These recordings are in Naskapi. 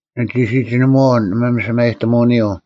ᓂᒋ ᓯᒋᓂᒧᐛᐤ ᓂ ᒪᒥᓴᒪᔨᑎᒧᐅᓂᔪᐤ;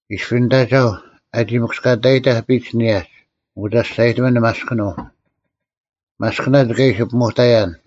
ᐃᔅᐱ ᓂᑦ ᐊᒐᐧᒄ ᐊᒋ ᒥᑯᔅᑲᑕᔨᑕᐧᒃ ᐱᒡ ᓂᔭᒡ, ᐊᑯ ᒐᔅᒐᔨᑎᒥᓐ ᓂ ᒪᔅᑭᓄᐤ᙮ ᒪᔅᑭᓇᒡ ᑲ ᐃᓯ ᐱᒧᑕᔭᓐ,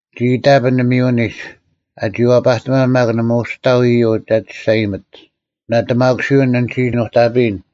ᓂᒋ ᐃᑕᐱᓐ ᓂᒥᔪᐅᓂᒡ, ᐊᒋ ᐛᐸᑎᒪᓐ ᒪᒃ ᓇᒪ ᐅᒋ ᑕᐤ ᐃᔪᐤ ᒐ ᒋᔅᒐᔨᒥᑦ: ᓇᑎᒪᑯᓯᐅᓐ ᓂᒋ ᓄᑕᐱᔨᓐ: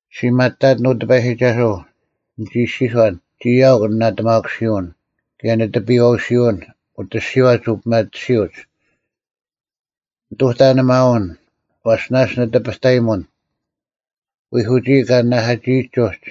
ᔅᒋ ᒪᑕᑎᓐ, ᐅ ᑎᐸᔨᒋᒐᓱᐤ: ᓂᒋ ᐃᔅᒋᔄᓐ, “ᒋᔾ ᐊᐅᒄ ᓂᓇᑎᒪᑯᓯᐅᓐ ᑭᔭ ᓂᑎᐱᔨᐛᐅᓯᐅᓐ ᐅᑦ ᐊᔅᒋᐛᒡ ᐅᐱᒪᑎᓯᐅᒡ᙮” ᓂᑐᑕ ᓂ ᒪᐅᓐ; ᐛᔅ ᓇᔅᒡ ᓂ ᑎᐱᑕᔨᒧᓐ, ᐃᐧᑯᒋᐃ ᑲ ᓂᓇᐧᑲᒋᐃᒡ ᐅᒡ;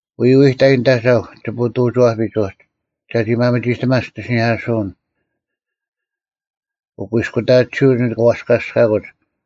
ᐎᐎᑕᐃ ᓂᑦ ᐊᒐᐧᒄ ᒋᐸᐅᑐᒋᐛᐱᒡ ᐅᒡ, ᒐᒋ ᒪᒥᒋᑕᒪᓐ ᒋᑦ ᐃᓯᓂᐧᑲᓱᐅᓐ᙮ ᐅᑯᐃᔅᑯᑕᑎᓯᐅᒡ ᓂᑭ ᐛᔅᑲᔅᑲᑯᒡ;